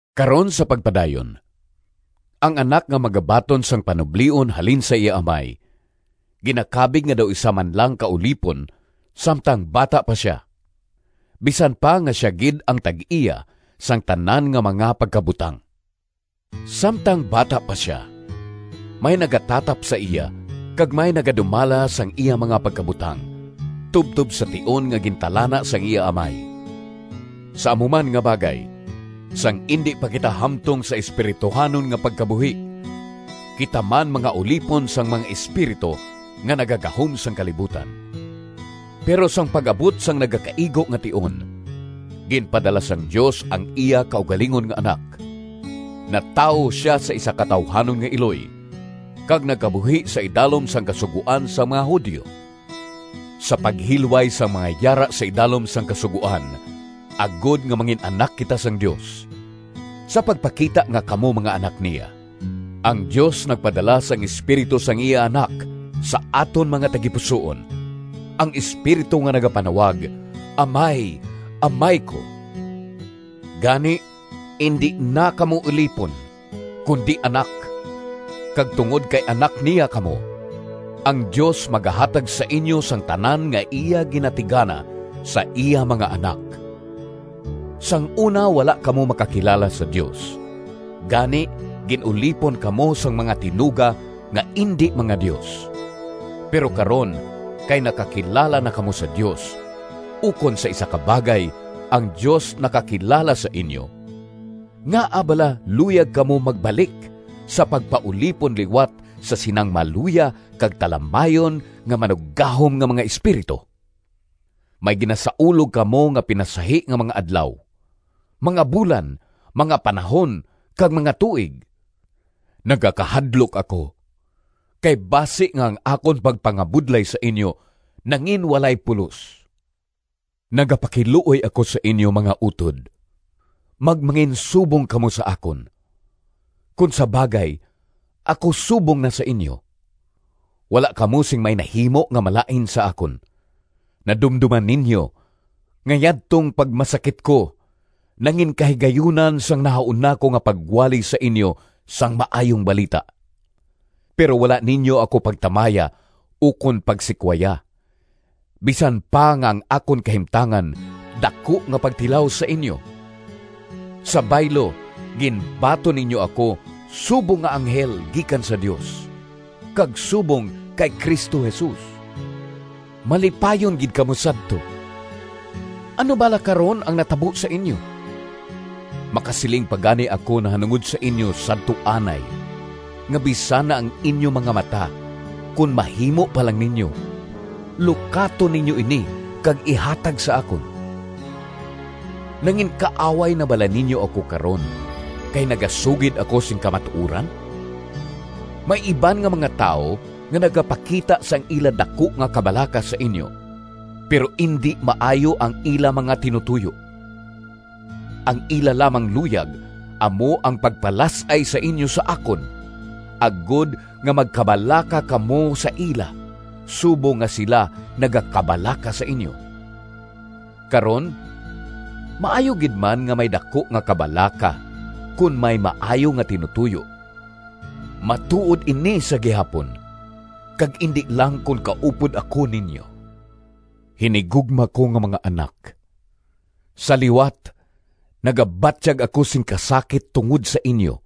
Karon sa pagpadayon: ang anak nga magabaton sang panublion halin sa iya amay ginakabig nga daw isa man lang ka ulipon samtang bata pa sia, bisan pa nga sia gid ang tag-iya sang tanan nga mga pagkabutang. Samtang bata pa sia, may nagatatap sa iya kag may nagadumala sang iya mga pagkabutang tubtob sa tion nga gintalana sang iya amay. Sa amo man nga bagay, sang indi pa kita hamtong sa espirituhanon nga pagkabuhi, kita man mga ulipon sang mga espiritu nga nagagahom sang kalibutan. Pero sang pag-abot sang nagakaigo nga tion, ginpadala sang Dios ang iya kaugalingon nga Anak. Natawo sia sa isa ka tawuhanon nga iloy, kag nagkabuhi sa idalom sang Kasugoan sang mga Judio, sa paghilway sang mga yara sa idalom sang Kasugoan, agod nga mangin-anak kita sang Dios. Sa pagpakita nga kamo mga anak niya, ang Dios nagpadala sang Espiritu sang iya Anak sa aton mga tagipusoon, ang Espiritu nga nagapanawag, “Amay, Amay ko.” Gani indi na kamo ulipon, kundi anak. Kag tungod kay anak niya kamo, ang Dios magahatag sa inyo sang tanan nga iya ginatigana sa iya mga anak. Sang una wala kamo makakilala sa Dios, gani gin-ulipon kamo sang mga tinuga nga indi mga dios. Pero karon kay nakakilala na kamo sa Dios, ukon sa isa ka bagay, ang Dios nakakilala sa inyo, ngaa bala luyag kamo magbalik sa pagpaulipon liwat sa sinang maluya kag talamayon nga manuggahom nga mga espiritu? May ginasaulog kamo nga pinasahi nga mga adlaw, mga bulan, mga panahon, kag mga tuig. Nagakahadlok ako kay basi nga ang akon pagpangabudlay sa inyo nanginwalay pulos. Nagapakiluoy ako sa inyo, mga utod, magmanginsubong kamo sa akon. Kon sa bagay, ako subong na sa inyo. Wala kamo sing may nahimo nga malain sa akon. Nadumdoman ninyo nga yadtong pagmasakit ko nanginkahigayunan sang nahauna ko nga pagwali sa inyo sang Maayong Balita. Pero wala ninyo ako pagtamaya ukon pagsikwaya, bisan pa nga ang akon kahimtangan daku nga pagtilaw sa inyo. Sa baylo, ginbaton ninyo ako subong nga anghel gikan sa Dios, kag subong kay Cristo Jesus! Malipayon gid kamo sadto! Ano bala karon ang natabo sa inyo? Makasiling pa gani ako nahanungod sa inyo sadto anay nga bisan ang inyo mga mata kon mahimo pa lang ninyo, lukaton ninyo ini kag ihatag sa akon! Nanginkaaway na bala ninyo ako karon kay nagasugid ako sing kamatuoran? May iban nga mga tawo nga nagapakita sang ila daku nga kabalaka sa inyo, pero indi maayo ang ila mga tinutoyo. Ang ila lamang luyag amo ang pagpalas-ay sa inyo sa akon, agod nga magkabalaka kamo sa ila subong nga sila nagakabalaka sa inyo. Karon, maayo gid man nga may daku nga kabalaka kon may maayo nga tinutoyo—matuod ini sa gihapon, kag indi lang kon kaupod ako ninyo. Hinigugma ko nga mga anak! Sa liwat, nagabatyag ako sing kasakit tungod sa inyo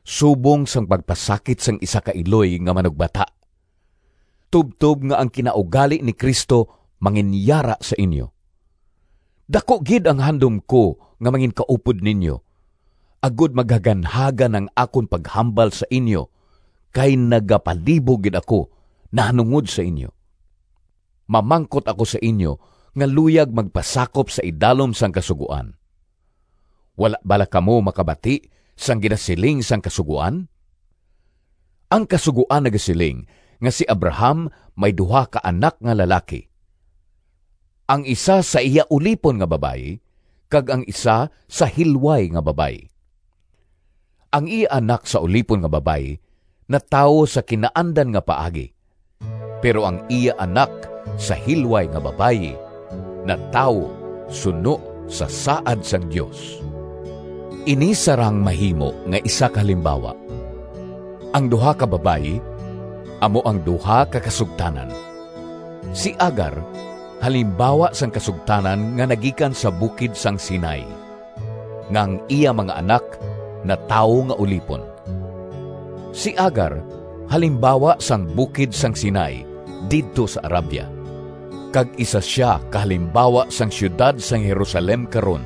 subong sang pagpasakit sang isa ka iloy nga manugbata, tubtob nga ang kinaugali ni Cristo manginyara sa inyo. Daku gid ang handom ko nga manginkaupod ninyo, agod maghaganhagan ang akon paghambal sa inyo, kay nagapalibog gid ako nahanungod sa inyo! Mamangkot ako sa inyo nga luyag magpasakop sa idalom sang Kasugoan: wala bala kamo makabati sang ginasiling sang Kasugoan? Ang Kasugoan nagasiling nga si Abraham may duha ka anak nga lalaki, ang isa sa iya ulipon nga babayi, kag ang isa sa hilway nga babayi. Ang iya anak sa ulipon nga babayi natawo sa kinaandan nga paagi, pero ang iya anak sa hilway nga babayi natawo suno sa saad sang Dios. Ini sarang mahimo nga isa ka halimbawa: ang duha ka babayi amo ang duha ka kasugtanan. Si Agar halimbawa sang kasugtanan nga nagikan sa bukid sang Sinai, nga ang iya mga anak natawo nga ulipon. Si Agar halimbawa sang bukid sang Sinai didto sa Arabia, kag isa sia ka halimbawa sang siyudad sang Jerusalem karon,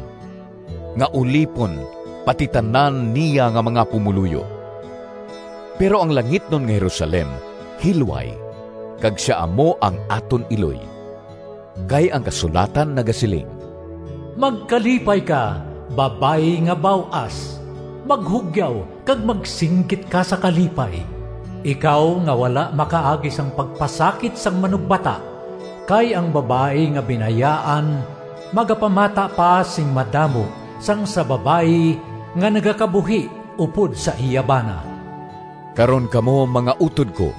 nga ulipon pati tanan niya nga mga pumoluyo. Pero ang langitnon nga Jerusalem hilway kag sia amo ang aton iloy. Kay ang kasulatan nagasiling: “Magkalipay ka, babayi nga baw-as! Maghugyaw kag magsinggit ka Sa kalipay, Ikaw nga wala makaagi Sang pagpasakit sang manugbata! Kay ang babayi nga binayaan Magapamata pa sing madamo Sang sa babayi Nga nagakabuhi upod sa iya bana.” Karon, kamo, mga utod ko,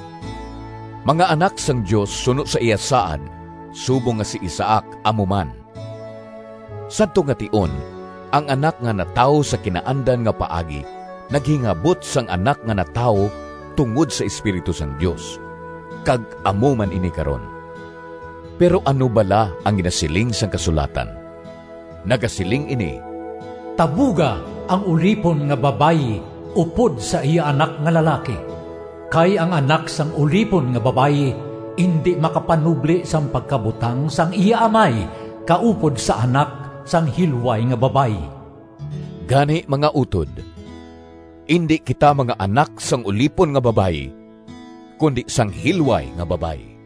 mga anak sang Dios suno sa iya saad subong nga si Isaac amo man. Sadto nga tion, ang anak nga natawo sa kinaandan nga paagi naghingabot sang anak nga natawo tungod sa Espiritu sang Dios, kag amo man ini karon. Pero ano bala ang ginasiling sang kasulatan? Nagasiling ini, “Tabuga ang ulipon nga babayi upod sa iya anak nga lalaki, kay ang anak sang ulipon nga babayi indi makapanubli sang pagkabutang sang iya amay kaupod sa anak sang hilway nga babayi.” Gani, mga utod, indi kita mga anak sang ulipon nga babayi, kundi sang hilway nga babayi.